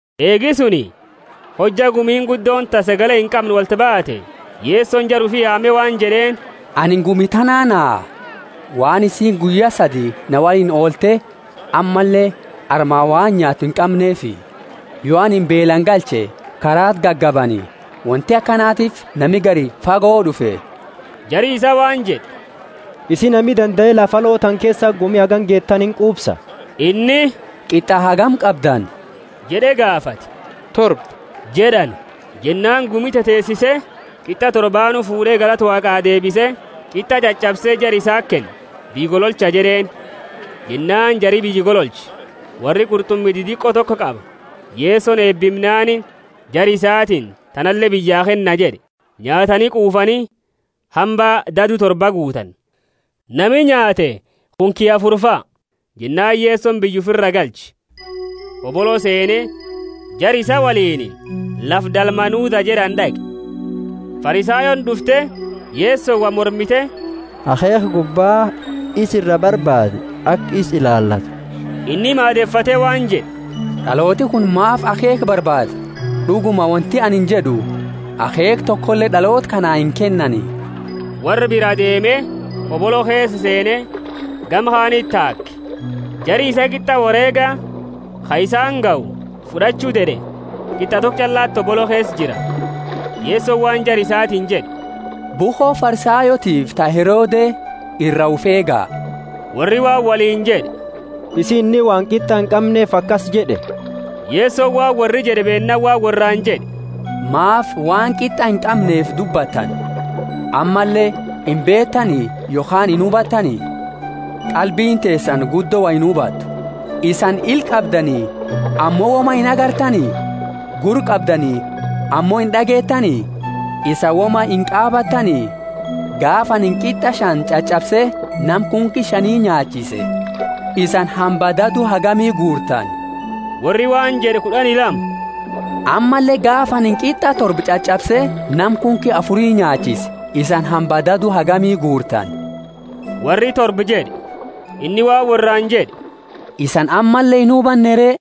Eegi suni, hojja gumiini guddooni ta sagale inqamne wolti baate, Yesoni jara ufi yaame waan jed'eeni, Anini gumi tanaa naha, waan isiini guyya sadi na woliini oolte, ammalle amma waan nyaattu inqamneefi. Yo anini beelaani galche, karaati gagabani, wonti akanatiifi nami gari fago d'ufe. Jari isa waan jed'e, Isi nami dandae lafa aloo tana keesati gumi hagana geetu tana inqufsa? Inni, Qit'a hagami qabdani? jed'e gaafate. Torba jed'ani. Jennaani gumi teteesise qit'a torbaanu fuud'e galata Waaqa deebise, qit'a ch'ach'abse jara isaati kenne, biyya gololcha jed'eeni. Jennaani jari biyya gololche. Worri qurt'umi didiqo toko qaba. Yesoni eebimnaani, jara isatiini, Tanale biyyaa kenna jed'e. Nyaatani quufani, hamba dadu torba guutani. Nami nyaate kunki afurifa. Jennaani Yesoni biyya ufira galche, hobolo seene, jara isaa woliini lafa Dalmanutha jed'ani d'aqe. Farisayooni d'ufte, Yesoni woi mormite, akheekha gubba isa iraa barbaade aka isa ilaalattu. Inni maadefate waan jed'e, D'alooti kuni maafi akheekha barbaada? D'uguma wonti anini jed'u akheekha tokole d'aloota kanaa inkennani. Worra biraa deeme, hobolo keesa seene, gama kaaniti taake. Jari isaa qit'a woreega ka isaani gahu fud'achu ded'ee, qit'a toko ch'allati hobolo keesa jira. Yesoni waan Jara isatiini jed'e, Bukho Farisayootiifi ta Herode ira ufi eega. Worri waan woliini jed'e, Isii inni waan qit'a inqamneefi akasi jed'e. Yesoni waan worri jed'e, Beennaani waan worraani jed'e Maafi waan qit'a inqamneefi dubbattani? Ammalle imbeetani yokhaani inhubatani? Qalbiini teesani guddo wo inhubattu. Isani ila qabdani ammo woma inagartani? Gurra qabdani ammo ind'ageetani? Isani woma inqaabatani? Gaafa anini qit'a shani ch'ach'abse nama kunki shani nyaachise, isani hamba dadu hagami guurtani? Worri waan jed'e kud'ani lama! Ammalle gaafa anini qit'a torba ch'ach'abse nama kunki afuri nyaachise, isani hamba dadu hagami guurtani? Worri! Torba jed'e. Inni waan worraani jed'e, Isani ammalle inhubanne re?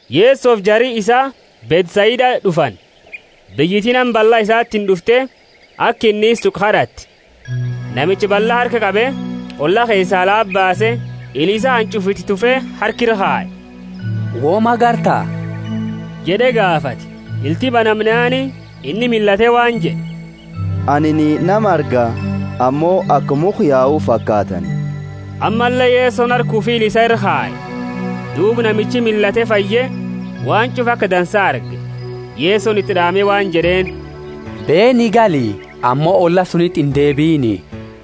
Yesofi jari isaa Bethsaida d'ufani. Biyyiti nama balla isatiini d'ufte, aka inni isa tuqu kad'atte. Namicha balla harka qabe, olla keesaa alati baase, ila isaa hanch'ufa iti tufe, harka ira kaye, Woma garta? jed'e gaafate. Ilti banamnaani, inni millate waan jed'e, Anini nama arga, ammo aka mukha yau fakaatani. Ammalle Yesoni harka ufi ila isaa ira kaye. Duuba namichi millate fayye, waan ch'ufa aka dansa arge. Yesoni iti d'aame waan jed'eeni, beeni gali ammo olla sunti indeebiini.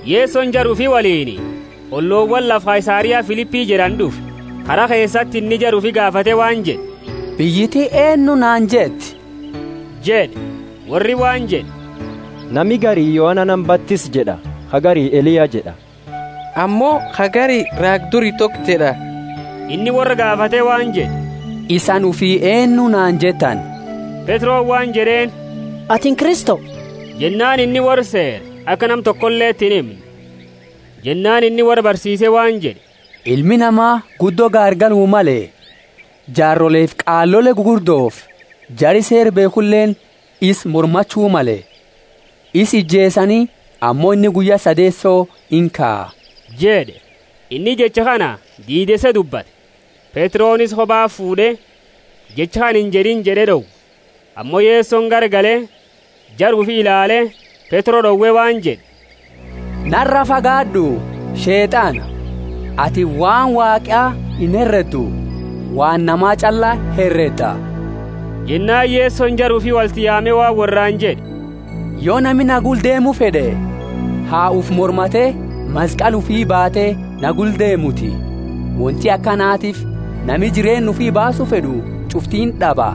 Yesoni jara ufi woliini ollowaani lafa Kaisaria Filipi jed'ani d'ufe. Kara keesati inni jara ufi gaafate waan jed'e, Biyyiti eennu naani jetti? jed'e. Worri waan jed'e, Nami gari Yohana nama batisu jed'a, ka gari Eliya jed'a, ammo ka gari raaga duri toko jed'a. Inni worra gaafate waan jed'e, Isani ufi eennu naani jettani? Petroni waan jed'eeni, Atini Kristo. Jennaani inni worraa seere, aka nama tokoleti inhimne. Jennaani inni worra barsiise waan jed'e, Ilmi Nama guddo gaargalu male, jaarolefi qaalole gugurdofi jari Seera beekhuleeni isa mormachu male. Isa ijeesani, ammo inni guyya sadeeso inkaa jed'e. Inni jecha kana diideese dubbate. Petroni isa koba fuud'e, Jecha kana injed'ini! jed'e d'owe. Ammo Yesoni garagale, jara ufi ilaale, Petro d'owe waan jed'e, Nara fagaad'u, Sheet'ana! Atini waan Waaqa inhereddu, waan nama ch'alla heredda. Jennaani Yesoni jara ufi wolti yaame waan worraani jed'e, Yo nami na gula deemu fed'e, ha ufi mormate, maskali ufi baate na gula deemuti. Wonti akanatiifi nami jireenna ufi baasu fed'u ch'ufti ind'aba,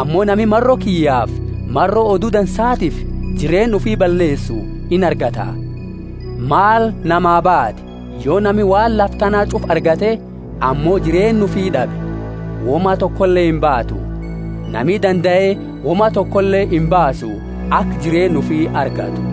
ammo nami maro kiyyafi maro Odu Dansaatiifi jireenna ufi balleesu inargata. Maal namaa baati, yo nami waan lafa tana ch'ufa argate, ammo jireenna ufi d'abe? Woma tokole imbaatu. Nami dandae woma tokole imbaasu, aka jireenna ufi argatu.